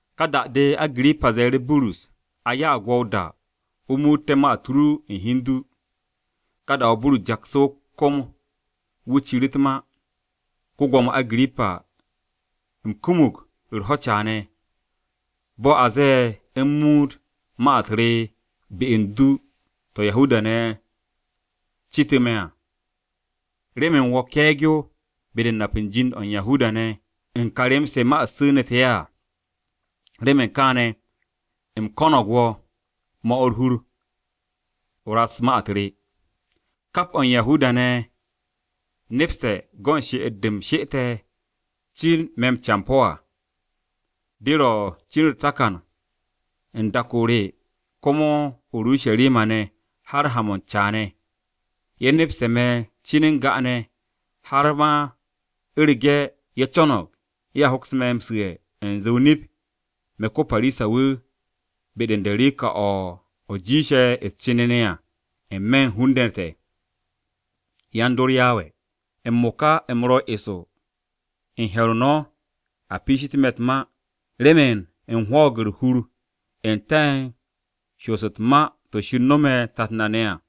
Ka da-de Agirippa ze̱e̱ru̱ Burus, “A ya'ag wo̱ o-da o muutte̱ ma-u̱t ru u̱n hi u̱n du.” Ka da-o̱ Burus jaksu̱ o-kom, wu̱ ciru̱ u̱t-ma: “Ko-Gwo̱mo Agirippa, u̱m kumug u̱r-ho̱ caane̱, bo̱ a ze̱e̱ u̱m muut ma-u̱t re be u̱n du to̱ Yahuda-ne̱ cetu̱ me̱ à. Remen wo̱ ke̱e̱g-yo be-de u̱n nap u̱n jind-o̱ u̱n Yahuda-ne̱ u̱n ka rem-se ma-u̱t su̱nu̱te̱ ye̱ à. Remen kaane̱, u̱m ko̱no̱g wo̱, 'mo̱ u̱r-hur, o raks ma-u̱t re. “Kap o̱ u̱n Yahuda-ne̱ ye̱ nepste̱ go̱n she'et-de u̱m she'ete̱ cin me̱ wan-campo̱ à, de ro̱ cin u̱r-takan u̱n dak-o re komo o-Urusharima ne̱ har haan-mo̱ u̱n caane̱. Ye̱ nepste̱ me̱ cin u̱n ga'ane̱, har ma u̱rege̱ ye̱ co̱no̱g ye̱a hoks me̱ m-su̱'e̱ u̱nze o-nip me̱ ko-Parisa-wu̱ be-de ka derika-o̱ o̱ jiishe̱ u̱s-cenene à n-me̱ u̱n hun-ne̱ te̱, yan-dor Yawe. M-mo̱ka, u̱m ro̱ eso u̱n he̱r-o no̱ a piishite̱ me̱ u̱t-ma remen u̱m hwo̱o̱g u̱r-hur n-te̱ u̱n shoos u̱t-ma to̱ Shir nome̱ tat na ne̱ à.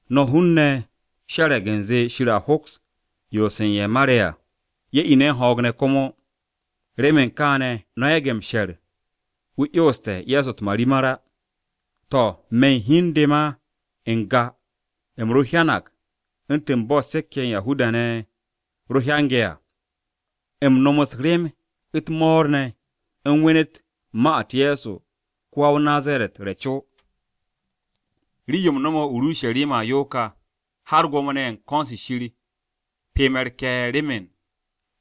No̱ hun-ne̱ she̱re̱g u̱nze Shir a hoks m-'yons u̱n ye̱ mare̱ à, ye̱ ine̱ u̱n ho̱o̱g ne̱ komo. Remen kaane̱, no̱ yage̱ m-she̱r u̱nze wu̱ 'yonste̱ Ye̱so u̱t-marimar á! “To̱, me̱ u̱n hi u̱n de ma n-ga, u̱m ro hyanag u̱ntu̱n bo̱ se̱k-ye̱ ye̱ u̱n Yahuda-ne̱ ro hyange̱ à. U̱m nom u̱s-rem u̱t-mo̱o̱r ne̱, u̱m wenet ma-u̱t Ye̱so ko-wa-o-Nazaret re̱ co. Rii-yo u̱m no̱me̱ o-Urusharima à yo ka. Har Gwo̱mo-ne̱ ye̱ u̱n ko̱n-se Shir pye me̱ u̱r-ke̱e̱r remen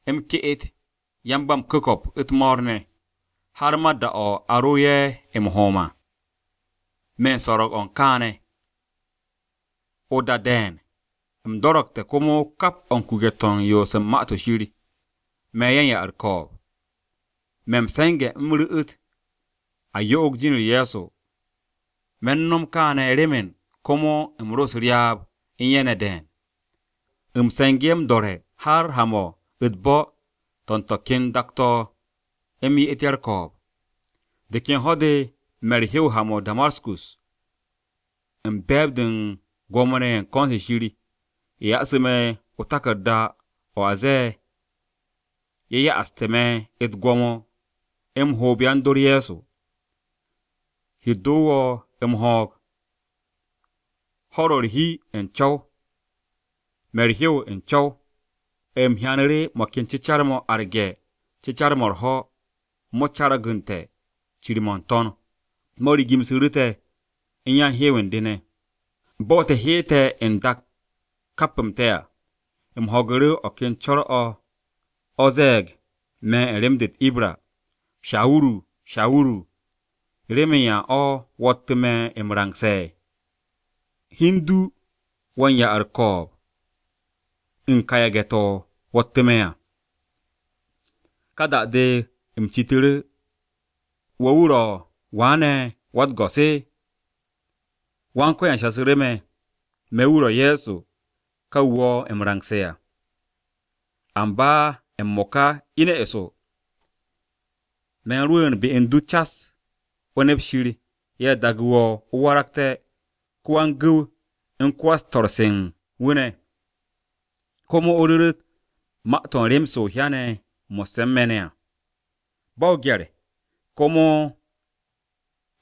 u̱m ke'et yan-ba-m-ku̱ko̱p u̱t-mo̱o̱r ne̱. Har ma da-o̱ a ro ye̱ m-hom à, me̱ u̱n so̱ro̱g-o̱ u̱n kaane̱. O-da de̱e̱n, u̱m do̱ro̱gte̱ komo kap o̱ u̱n kuke̱-to̱ u̱n yoos u̱n Ma-to̱ Shir, me̱ ye̱ u̱n ya-u̱r-ko̱o̱b, me̱ m-se̱nge̱ u̱m ru̱'u̱t ye̱ yo'og jin-u̱r Ye̱so. Me̱ u̱n no̱m kaane̱ remen komo u̱m ro u̱s-ryaab u̱n ye̱ ne̱ de̱e̱n. U̱m se̱ngu̱ ye̱ m-do̱re̱ har ha-mo̱ u̱t-bo̱ to̱ u̱n to̱ ken dak-to̱ u̱m ye'et ye̱ u̱r-ko̱o̱b.” “De ken ho̱-de me̱ u̱r-hew ha-mo̱ o-Damaskus, u̱n be̱e̱b-de u̱n Gwo̱mo-ne̱ ye̱ u̱n ko̱n-se Shir, ye̱ ya'asu̱ me̱ o-taku̱rda o̱ ze̱e̱ ye̱ ya'aste̱ me̱ u̱t-gwo̱mo m-hoob yan-dor Ye̱so. Shir do wo̱ m-ho̱o̱g! Ho̱-u̱r ro̱ u̱r-hi n-co̱w, me̱ u̱r-hew u̱n co̱w. U̱m hyanu̱ru̱ mo̱ ken cecar-mo̱ arge̱ cecar-mo̱ u̱r-ho̱ mo̱ cargu̱nsu̱te̱ cir-mo̱ n-to̱n, mo̱ rigimsu̱ru̱ te̱ u̱n yan-u̱r-hew u̱n de ne̱. Bo̱ te̱ hyeete̱ n-dak kap-m te̱ à, u̱m ho̱gu̱ru̱ o̱ ken co̱r-o̱ o̱ ze̱e̱g me̱ u̱n rem-de u̱t-Ibra, ‘Shawuru, Shawuru, ¿remen yan o̱ wo̱ttu̱ me̱ m-rangse̱? Hi u̱n du wo̱ u̱n ya-u̱r-ko̱o̱b u̱n ka yage̱-to̱ wo̱ttu̱ me̱ à.’ “Ka da-de, u̱m citu̱ru̱, ‘¿Wo̱ wu̱ ro̱ wa ne̱ Wa-u̱t-Go̱s?’ “Wan-Ko̱yan shasu̱ru̱ me̱, ‘Me̱ wu̱ ro̱ Ye̱so ka wu̱ wo̱ m-rangse̱ à. Amba m-mo̱ka ine̱ eso. Me̱ u̱n rwu̱u̱n be u̱n du cas o nept Shir ye̱ daagu̱ wo̱ o waragté̱ ko-wan-gu̱w u̱n ko-wan-swo̱-se u̱n wu̱ ne̱. Komo o ru̱ru̱t ma-to̱ u̱n rem-se o hyane̱ mo̱sse̱ u̱n me̱ ne̱ à ba o-gye̱r, komo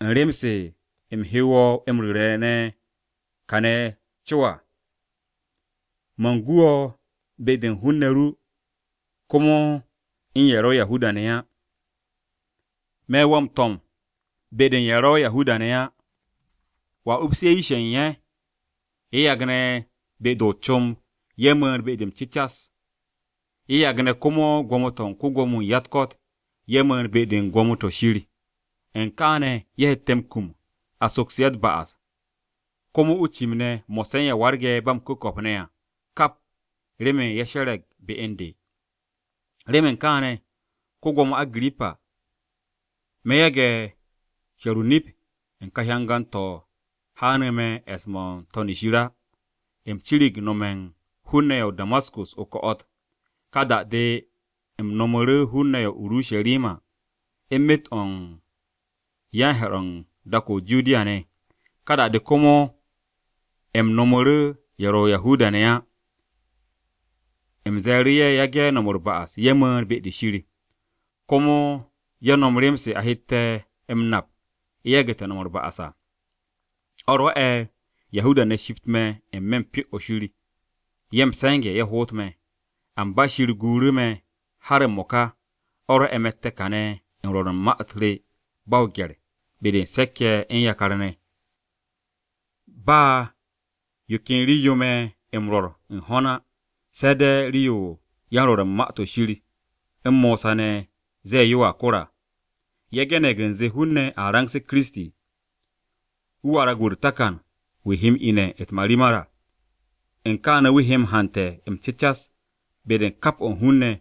u̱n rem-se, u̱m he wo̱ m-ru̱re̱ ne̱ kane̱ co à. Man gu wo̱ be-de u̱n hun-ne̱ ru, komo u̱n ye̱ ro̱ Yahuda-ne̱ á. Me̱ wo̱ m-to̱m be-de u̱n ye̱ ro̱ Yahuda-ne̱ á. Wo̱a upsu̱ ye̱ yish-ye̱ u̱n ye̱, ye̱ yagne̱ be-de o-comb ye̱ mu̱u̱n be-de m-cu̱cas, ye̱ yagne̱ komo gwo̱mo-to̱ u̱n ko-Gwo̱mo-wu̱ u̱n ya-u̱t-ko̱t ye̱ mu̱u̱n be-de u̱n Gwo̱mo-to̱ Shir. U̱n kaane̱ ye̱ hette̱ m-kum a soksu̱ ye̱ u̱t-ba'as, komo o-cim ne̱ mo̱sse̱ u̱n ye̱ warge̱ ba m-ku̱ko̱p ne̱ à kap remen ye̱ she̱re̱g be u̱n de.’ “Remen kaane̱, ko-Gwo̱mo Agirippa, me̱ yage̱ she̱r o-nip u̱n ka hyangan-to̱ haanu̱ me̱ e̱s-mo̱ n-To̱n shir á. U̱m cirig nome̱ u̱n hun-ne̱ ye̱ o-Damaskus o-ko̱'o̱t. Ka da-de u̱m nomu̱ru̱ hun-ne̱ ye̱ o-Urusharima u̱n myet-o̱ u̱n yan-he̱r-o̱ u̱n dak-o̱ o-Judiya ne̱. Ka da-de, komo u̱m nomu̱ru̱ ye̱ ro̱ Yahuda-ne̱ á u̱m ze̱e̱ru̱ ye̱ yage̱ u̱r-ba'as ye̱ mu̱u̱n be-de Shir, komo ye̱ nom rem-se a hette̱ m-nap ye̱ yagu̱te̱ u̱r-ba'as à. O̱ rwo̱'e̱ Yahuda-ne̱ shipt me̱ n-me̱ u̱n Pyo-o̱ Shir ye̱ m-se̱nge̱ ye̱ hoot me̱. Amba Shir guuru̱ me̱ har m-mo̱ka. O̱ rwo̱'e̱ me̱tte̱ kane̱ u̱n rwo̱r u̱n ma-u̱t re ba o-gye̱r be-de u̱n se̱k-ye̱ u̱n yakar-ne̱. Ba yo ken rii-yo me̱ m-rwo̱r u̱n ho̱n á se̱ de̱ rii-yo yan-Rwo̱r u̱n Ma-to̱ Shir u̱n Mosa ne̱ ze̱e̱ yoa kor à. Ye̱ ge̱ne̱g u̱nze, hun-ne̱ a rangse̱ Kiristi. Wu̱ warag wu̱ u̱r-takan wu̱ he m-ine̱ u̱t-marimar à. U̱n kaane̱ wu̱ he hante̱ m-cecas be-de u̱n kap o̱ u̱n hun-ne̱,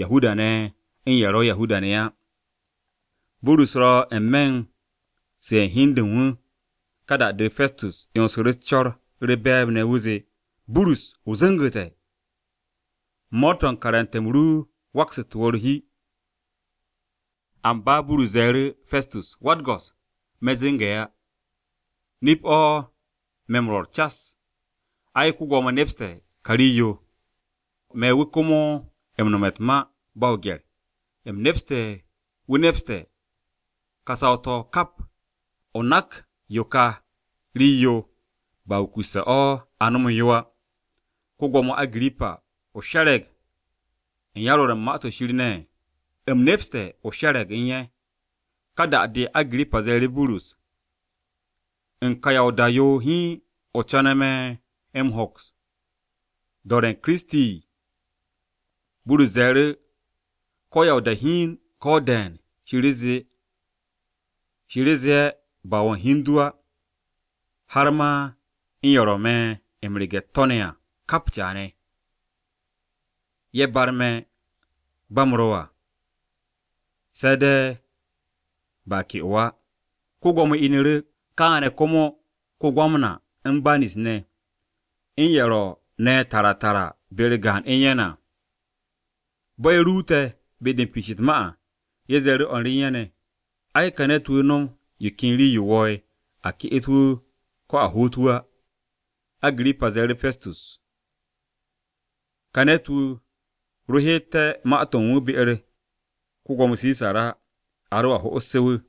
Yahuda-ne̱ u̱n ye̱ ro̱ Yahuda-ne̱ á.” Burus ro n-me̱ u̱n su̱'e̱ hi u̱n de u̱n wu̱, ka da-de Pestus 'yonsu̱ru̱ u̱s-co̱r u̱r-be̱e̱b ne̱ wu̱ zee, “Burus, o zu̱ngu̱te̱! Mo̱o̱r-to̱ u̱n karante̱-m ru waksu̱te̱ wo̱ u̱r-hi!” Amba Burus ze̱e̱ru̱, “Pestus, Wa-u̱t-Go̱s, me̱ zu̱nge̱ á. Nip-o̱ me̱ m-rwo̱r cas. Ai, ko-Gwo̱mo nepste̱ ka rii-yo, me̱ wu̱ komo u̱n nome̱ u̱t-ma ba o-gye̱r. U̱m nepste̱ wu̱ nepste̱ to̱ ka saw-to̱ kap, o nak yo ka rii-yo ba wukusse̱ o̱ a nomu̱ yo á. Ko-Gwo̱mo Agirippa, ¿o she̱re̱g u̱n yan-Rwo̱r u̱n Ma-to̱ Shir ne̱? U̱m nepste̱ o she̱re̱g u̱n ye̱.” Ka da-de, Agirippa ze̱e̱ru̱ Burus, “¿U̱n ka ya o-da yo hiin o co̱ne̱ me̱ m-hoks do̱re̱ u̱n Kiristi?” Burus ze̱e̱ru̱, “Ko̱ ya o-da hiin, ko̱ de̱e̱n, Shir zee ba wo̱ u̱n ho̱n du á, har ma u̱n ye̱ ro̱ me̱ m-rege̱ u̱t-to̱ ne̱ à kap caane̱, ye̱ barme̱ bo̱ u̱m ro̱ à, se̱ de̱ ba ke'o á.” Ko-Gwo̱mo inu̱ru̱, kaane̱ komo ko-Gwamna u̱n Banis ne̱, u̱n ye̱ ro̱ ne̱ tara tara be-u̱r gaan u̱n ye̱ ne̱ à. Bo̱ ye̱ ruute̱ be-de u̱n piish u̱t-ma à, ye̱ ze̱e̱ru̱ o̱r re u̱n ye̱ ne̱, “Ai, ka ne̱t-wu̱ nom yo ken rii-yo wo̱o̱'e̱ a ke'et wu̱ ko̱ a hoot wu̱ á.” Agirippa ze̱e̱ru̱ Pestus, “Ka ne̱t-wu̱ ro heete̱ ma-to̱ u̱n wu̱ be-u̱r ko-Gwo̱mo Sisar á, a roa ho'ose̱ wu̱.”